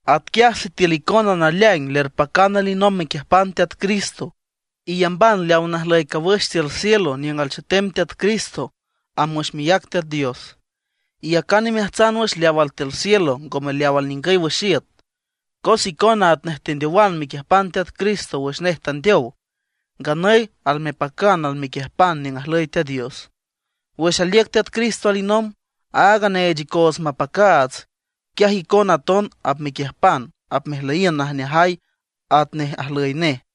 Atquiaj sitiül icona naleaing lerpacan alinomb mequiüjpan Teat Cristo, iyamban leaw najlüy cawüx tiül cielo niüng alchetem Teat Cristo amb wüx miác Teat Dios. Iyacan imeajtsan wüx leaw altiül cielo, ngome leaw alningüy wüx iüt. Cos icona atnej tendeowan mequiüjpan Teat Cristo wüx nej tandeow; nganüy almepacan almequiüjpan niüng ajlüy Teat Dios. Wüx aliüc Teat Cristo alinomb, aaga neech icoots mapacaats, quiaj icona aton apmequiüjpan, apmejlüyiün najneajay atnej ajlüy nej.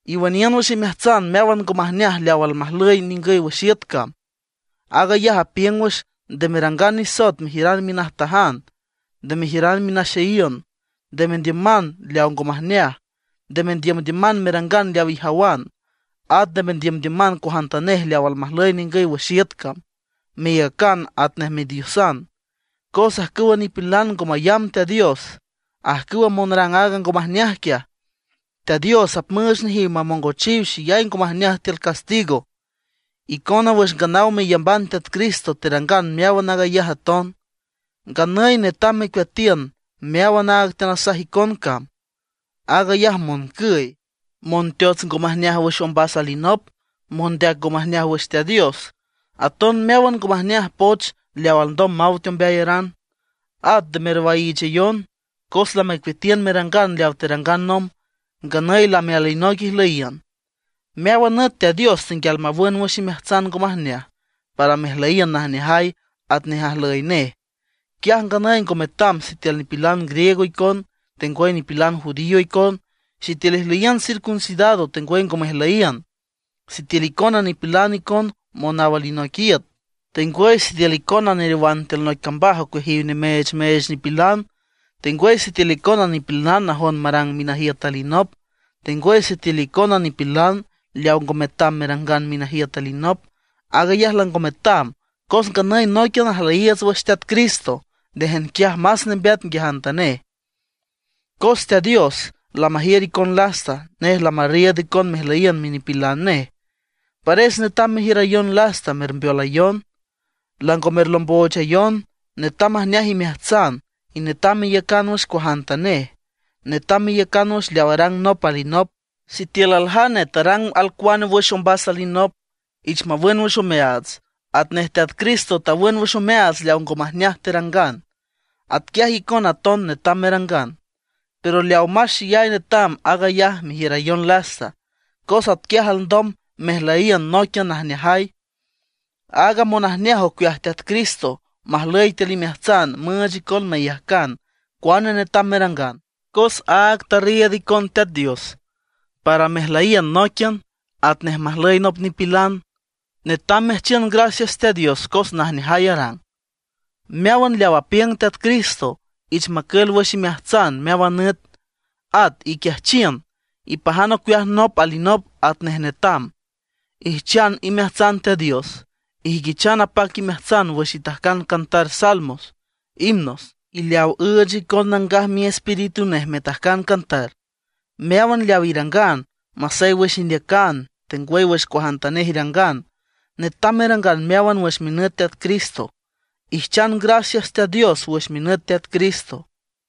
Iwüniün wüx imeajtsan meáwan ngo majneaj leaw almajlüy ningüy wüx iüt cam. Aag ayaj apiüng wüx: nde merangan nisoet mejiüran minajtajan, nde mejiüran minaxeyiün; nde mendiüman leaw ngo majneaj; nde mendiümdiüman merangan leaw ijawan; at nde mendiümdiüman cuajantanej leaw almajlüy ningüy wüx iüt cam, meyacan atnej midiosan. Cos ajcüwa nipilan ngo mayamb Teat Dios, ajcüw monrang aaga ngo majneaj quiaj, Teat Dios apmüüch nejiw mamongochiw xeyay ngo majneaj tiül Castigo. Icona wüx nganaw meyamban Teat Cristo terangan meáwan aag ayaj aton. Nganüy netam mecueatiün meáwan aaga teanasaj icon cam: aag ayaj moncüy, monteots ngo majneaj wüx ombas alinop, mondeac ngo majneaj wüx Teat Dios; aton meáwan ngo majneaj poch leaw alndom maw teombeayaran. At nde merwaiichayon, cos lamecueatiün merangan leaw terangan nomb. Nganüy lame alinoic ijlüyiün. Meáwan nüt Teat Dios tenguial mawün wüx imeajtsan ngo majneaj, para mejlüyiün najneajay atnej ajlüy nej. Quiaj nganüy ngo metam sitiül nipilan griego icon, tengwüy nipilan judío icon; sitiül ijlüyiün circuncidado, tengwüy ngo mejlüyiün; sitiül icona nipilan icon naw alinoic iüt, tengwüy sitiül icona neriowan tiül noic cambaj ocueajiw nemeechmeech nipilan; tengwüy sitiül icona nipilan najon marang minajiüt alinop, tengwüy sitiül icona nipilan leaw ngo metam merangan minajiüt alinop. Aag ayaj lango metam, cos nganüy nóiquian ajlüyiiüts wüx Teat Cristo; néjan quiaj más nembeat nguiajantanej. Cos Teat Dios lamajiür icon lasta, nej lamarriiüd icon mejlüyiün minipilan nej. Pares netam merjiürayon lasta, mermbeolayon. Lango merlomboochayon; netam majneaj imeajtsan, y netam meiücan wüx cuajantanej. Netam meiücan wüx leaw arang nop alinop; sitiül aljane tarangüch alcuane wüx ombas alinop, ich mawün wüx omeaats. Atnej Teat Cristo tawün wüx omeaats leaw ngo majneaj terangan, atquiaj icona aton netam merangan. Pero leaw más xeyay netam, aag ayaj merjiürayon lasta, cos atquiaj alndom mejlüyiün nóiquian najneajay. Aaga monajneaj ocueaj Teat Cristo majlüy tiül imeajtsan müüch icon meyajcan cuane netam merangan, cos áag tarriiüd icon Teat Dios para mejlüyiün nóiquian atnej majlüy nop nipilan. Netam meajchiün gracias Teat Dios cos najneajay arang. Meáwan leaw apiüng Teat Cristo, ich macül wüx imeajtsan meáwan nüt. At iquiajchiün, ipajan ocueaj nop alinop atnej netam. Ijchan imeajtsan Teat Dios, ijüiquichan apac imeajtsan wüx itajcan cantar salmos, himnos, y leaw üüch icon Nangaj Miespíritu nej metajcan cantar. Meáwan leaw irangan, masey wüx indeacan, tengwüy wüx cuajantanej irangan, netam merangan meáwan wüx minüt Teat Cristo. Ijchan gracias Teat Dios wüx minüt Teat Cristo.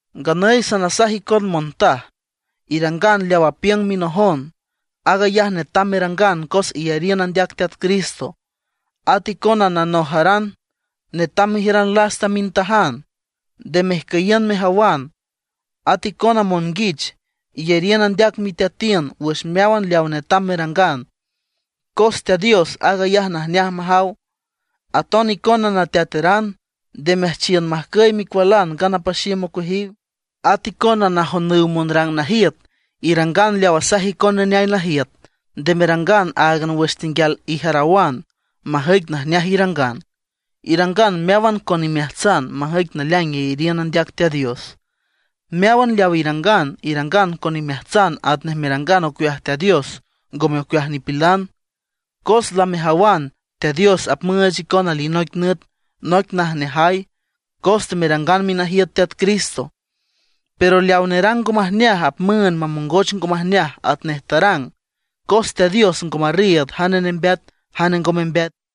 Nganüy sanasaj icon montaj, irangan leaw apiüng minojon. Aag ayaj netam merangan cos iyariün andeac Teat Cristo. At icona nanojaran, netam mejiüran lasta mintajan, nde mejcüyiün mejawan. At icona monguich, iyariün andeac miteatiün wüx meáwan leaw netam merangan, cos Teat Dios aag ayaj najneaj majaw. Aton icona nateateran, nde meajchiün majcüy micualan ngana paxiüm ocueajiw. At icona najonüw monrang najiüt, irangan leaw asaj icon neneay najiüt. Nde merangan áagan wüx tenguial ijarawan, majüic najneaj irangan. Irangan meáwan con imeajtsan, majüic naleaing iyariün andeac Teat Dios. Meáwan leaw irangan, irangan con imeajtsan atnej merangan ocueaj Teat Dios, ngome ocueaj nipilan. Cos lamejawan Teat Dios apmüüch icon alinoic nüt noic najneajay, cos temerangan minajiüt Teat Cristo. Pero leawa nerang ngo majneaj apmüünd mamongoch ngo majneaj atnej tarang, cos Teat Dios ngo marriiüd jane nembeat, jane ngo membeat.